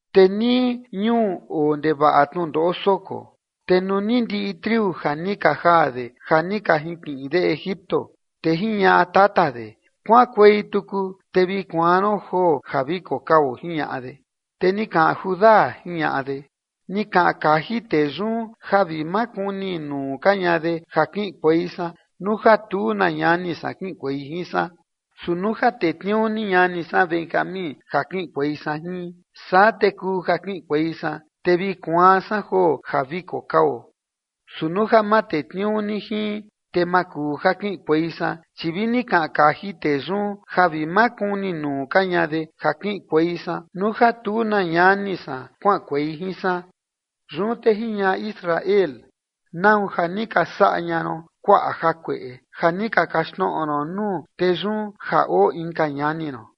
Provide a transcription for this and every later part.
Te nii ñuu oo ndevaꞌa tnundoꞌo soko, te nuu ni ndiꞌi triu ja ni ka jaa de ja ni ka jinkiꞌin de Egipto, te jiñaꞌa tata de: ―Kuaꞌankuei tuku te vi kuaan ron joo ja vi kokao ―jiñaꞌa de. Te ni kaꞌan Judá, jiñaꞌa de: ―Ni kaꞌan kaji tee yun ja vi ma kuni nuu ka ña de ja kiꞌinkuei san nuu ja tu na ñani san kiꞌinkuei jin san. Su nuu ja tetniuu ni ñani san Benjamín ja kiꞌinkuei san jin, saa te kuu ja kiꞌinkuei san, te vi kuaan san joo ja vi kokao. Su nuu ja ma tetniuu ni jin, te ma kuu ja kiꞌinkuei san, chi vi ni kaꞌan kaji tee yun ja vi ma kuni nuu ka ña de ja kiꞌinkuei san nuu ja tu na ñani san kuaꞌankuei jin san. Yun te jiñaꞌa Israel: ―¿Nau ja ni ka saꞌa ña ron kuaꞌa jakueꞌe, ja ni ka kaxtnoꞌo ron nuu tee yun ja oo inka ñani ron?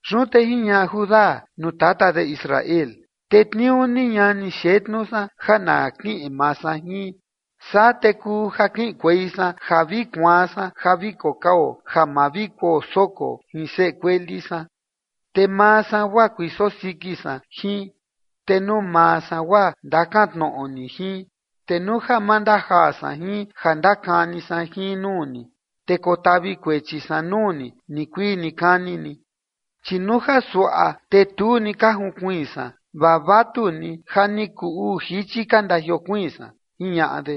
Yun te jiñaꞌa Judá nuu tata de Israel: ―Tetniuu ni ñani xetnu san ja na kiꞌin maa san jin, saa te kuu ja kiꞌinkuei san ja vi kuaan san ja vi kokao ja ma vi kuo soko jin seꞌe kueli san. Te maa san guaa kuiso siki san jin, te nuu maa san guaa ndakantnoꞌo ni jin, te nuu ja ma ndajaa san jin ja ndakani san jin nuu ni, te kotavi kuechi san nuu ni nikuii nikani ni. Chi nuu ja suaꞌa te tu ni ka junkuiin san, vaa vatu ni ja ni kuu uu jichi ka ndajiokuiin san ―jiñaꞌa de.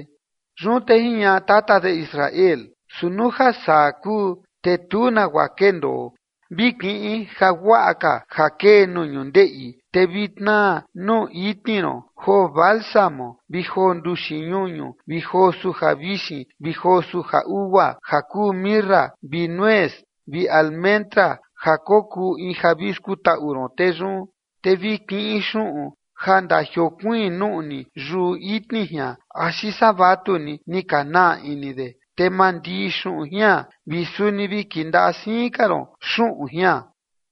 Yun te jiñaꞌa tata de Israel: ―Su nuu ja saa kuu, te tu ka nagua kendoo. Vi kiꞌin ja guaꞌa ka ja kee nuu ñundeꞌi, te vi tnaa nuu itni ron joo bálsamo vi joo nduxi ñuñu vi joo suja vixin vi joo suja ugua ja kuu mirra vi nuez vi almendra ja kokuu in ja vi skutaꞌu ron tee yun. Te vi kiꞌin xuꞌun ja ndajiokuiin nuꞌni yuꞌu itni jian axi saa vatu ni ni ka naa ini de, te mandii xuꞌun jian vi suni vi kindaꞌa siin ka ron xuꞌun jian.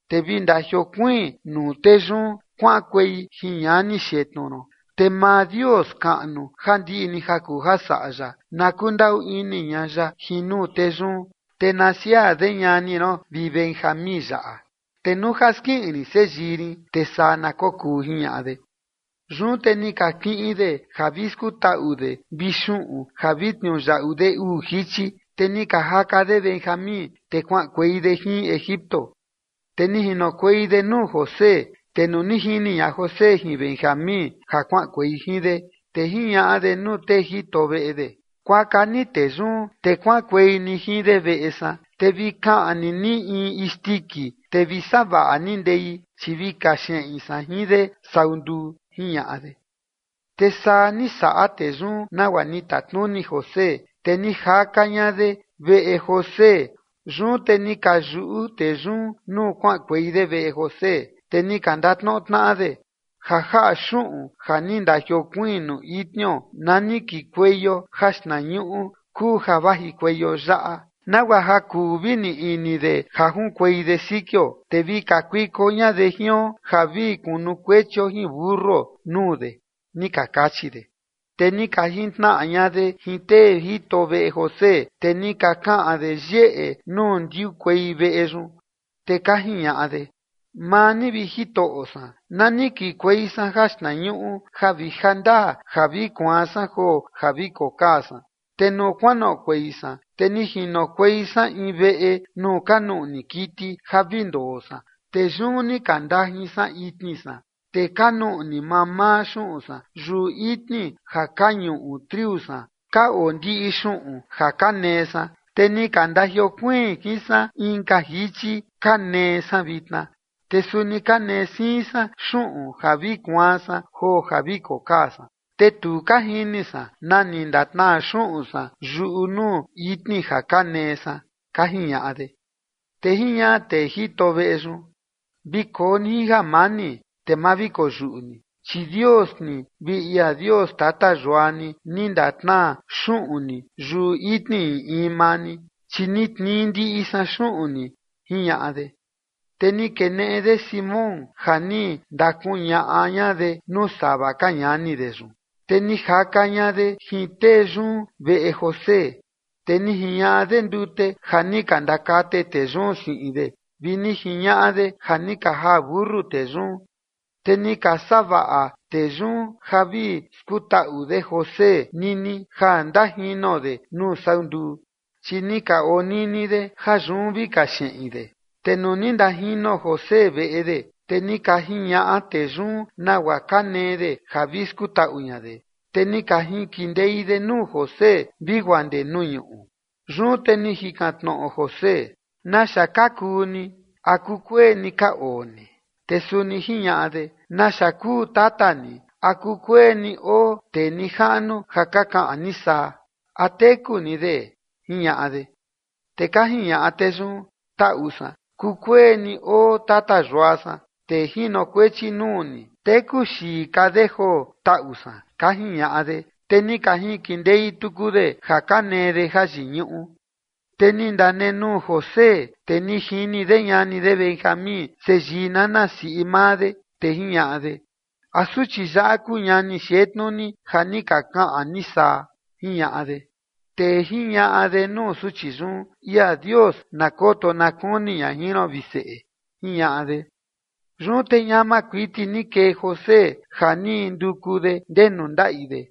Te vi ndajiokuiin nuu tee yun kuaꞌankuei jin ñani xetnu ron. Te maa Dios kaꞌnu, ja ndiꞌi ni ja kuu saꞌa ya, na kundaꞌu ini ña ya jin nuu tee yun, te na siaa de ñani ron vi Benjamín yaꞌa, te nuu ja skiꞌin rin seyii rin, te saa na kokuu ―jiñaꞌa de. Yun te ni ka kiꞌin de ja vi skutaꞌu de vi xuꞌun ja vi tniuyaꞌu de uu jichi, te ni ka jaka de Benjamín, te kuaꞌankuei de jin Egipto, te ni jinokuei de nuu José. Te nuu ni jini ña José jin Benjamín ja kuaꞌankuei jin de, te jiñaꞌa de nuu tee jito veꞌe de: ―Kuaka ni tee yun te kuaꞌankuei ni jin de veꞌe san, te vi kaꞌni ni in isndiki, te vi savaꞌa ni ndei, chi vi kaxeꞌin san jin de sau nduu ―jiñaꞌa de. Te saa ni saꞌa tee yun nagua ni tatnuni José, te ni jaka ña de veꞌe José. Yun te ni ka yuꞌu tee yun nuu kuaꞌankuei de veꞌe José, te ni ka ndatnoꞌo tnaꞌa de: ―Ja jaꞌa xuꞌun ja ni ndajiokuiin nuu itnio na ni kikueio jaxtnañuꞌu kuu ja vajikueio yaꞌa, nagua ja kuu vi nii ini de ja junkuei de sikio, te vi kakuiko ña de jion ja vi kunukuechio jin mentuo nuu de ―ni ka kachi de. Te ni ka jintnaꞌa ña de jin tee jito veꞌe José, te ni ka kaꞌan de yeꞌe nuu ndiukuei veꞌe yun. Te ka jiñaꞌa de: ―Maa ni, vi jitoꞌo san, na ni kikuei san jaxtnañuꞌu ja vi jandaa ja vi kuaan san joo ja vi kokaa san. Te nuu kuanoꞌokuei san, te ni jinokuei san in veꞌe nuu ka nuꞌni kiti ja vi ndoo san. Te yun ni ka ndajin san itni san, te ka nuꞌni mamaa xuꞌun san yuꞌu itni ja ka ñuꞌu triu san ka oo ndiꞌi xuꞌun ja ka nee san, te ni ka ndajiokuiin jin san inka jichi ka nee san vitna. Te suni ka nee siin san xuꞌun ja vi kuaan san joo ja vi kokaa san, te tu ka jini san na ni ndatnaa xuꞌun san yuꞌu nuu itni ja ka nee san ―ka jiñaꞌa de. Te jiñaꞌa tee jito veꞌe yun: ―Vi koo ni jin jamani, te ma vi koyuꞌu ni, chi Dios ni vi ia Dios tata yua ni, ni ndatnaa xuꞌun ni yuꞌu itni in in maa ni, chi ni tnii ndiꞌi san xuꞌun ni ―jiñaꞌa de. Te ni keneꞌe de Simeón ja ni ndakuñaꞌa ña de nuu sava ka ñani de yun. Te ni jaka ña de jin tee yun veꞌe José, te ni jiñaꞌa de ndute ja ni ka ndakate tee yun siꞌin de, vi ni jiñaꞌa de ja ni ka jaa mentu tee yun. Te ni ka savaꞌa tee yun ja vi skutaꞌu de José nini ja ndajino de nuu sau nduu, chi ni ka onini de ja yun vi kaxeꞌin de. Te nuu ni ndajino José veꞌe de, te ni ka jiñaꞌa tee yun nagua ka nee de ja vi skutaꞌu ña de, te ni ka jinkindei de nuu José vi guaa ndee nuu ñuꞌu. Yun te ni jikan tnoꞌo José: ―¿Naxa ka kuu ni? ¿A kukueni ka oo ni? Te suni jiñaꞌa de: ―¿Naxa kuu tata ni? ¿A kukueni oo tee nijaꞌnu ja ka kaꞌan ni saa? ¿A teku ni de? ―jiñaꞌa de. Te ka jiñaꞌa tee yun: ―Taꞌu san. Kukueni oo tata yua san, tee jinokuechi nuu ni, teku xii ka de joo, taꞌu san ―ka jiñaꞌa de, te ni ka jinkindei tuku de ja ka nee de ja yiñuꞌu. Te ni ndanenuu José, te ni jini de ñani de Benjamín seyii nana siꞌi maa de, te jiñaꞌa de: ―¿A suchi yaꞌa kuu ñani xetnu ni ja ka kaꞌan ni saa? ―jiñaꞌa de. Te jiñaꞌa de nuu suchi yun: ―Ia Dios na koto na kuni ña jin ron, vi seꞌe ―jiñaꞌa de. Yun te ñama kuiti ni kee José ja ni nduku de ndenu ndaꞌi de,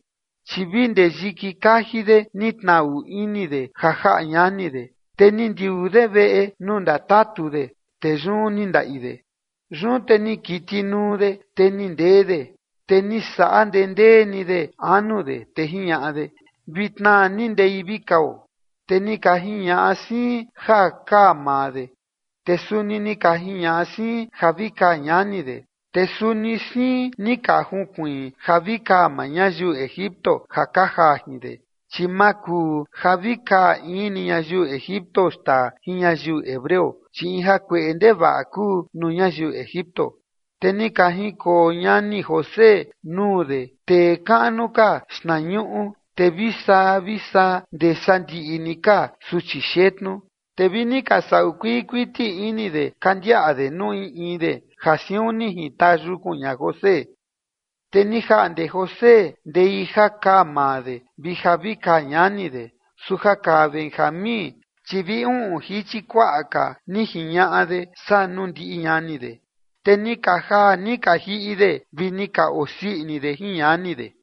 chi vi ndee yiki kaji de ni tnaꞌu ini de ja jaꞌa ñani de, te ni ndiuu de veꞌe nuu ndatatu de, te yun ni ndaꞌi de. Yun te ni kitinuu de, te ni ndee de, te ni saꞌa ndendee ni de anu de, te jiñaꞌa de: ―Vi tnaa ni ndei vi kao. Te ni ka jiñaꞌa siin ja kaa maa de, te suni ni ka jiñaꞌa siin ja vi kaa ñani de, te suni siin ni ka junkuiin ja vi kaa maa ñayiu Egipto ja ka jaa jin de, chi ma kuu ja vi kaa in ni ñayiu Egipto xtaa jin ñayiu hebreo, chi in jakueꞌe ndevaꞌa kuu nuu ñayiu Egipto. Te ni ka jinkoo ñani José nuu de tee kaꞌnu ka xtnañuꞌu, te vi saa vi saa ndee sandiꞌi ni ka suchi xetnu. Te vi ni ka saꞌu kuii kuiti ini de ka ndiaꞌa de nuu in in de, ja siun ni jintaa yukun ña José. Te ni jaꞌnde José ndei ja kaa maa de vi ja vi kaa ñani de, su ja kaa Benjamín, chi vi uꞌun jichi kuaꞌa ka ni jiñaꞌa de saa nuu ndiꞌi ñani de. Te ni ka jaa ni ka jiꞌi de vi ni ka osii ini de jin ñani de.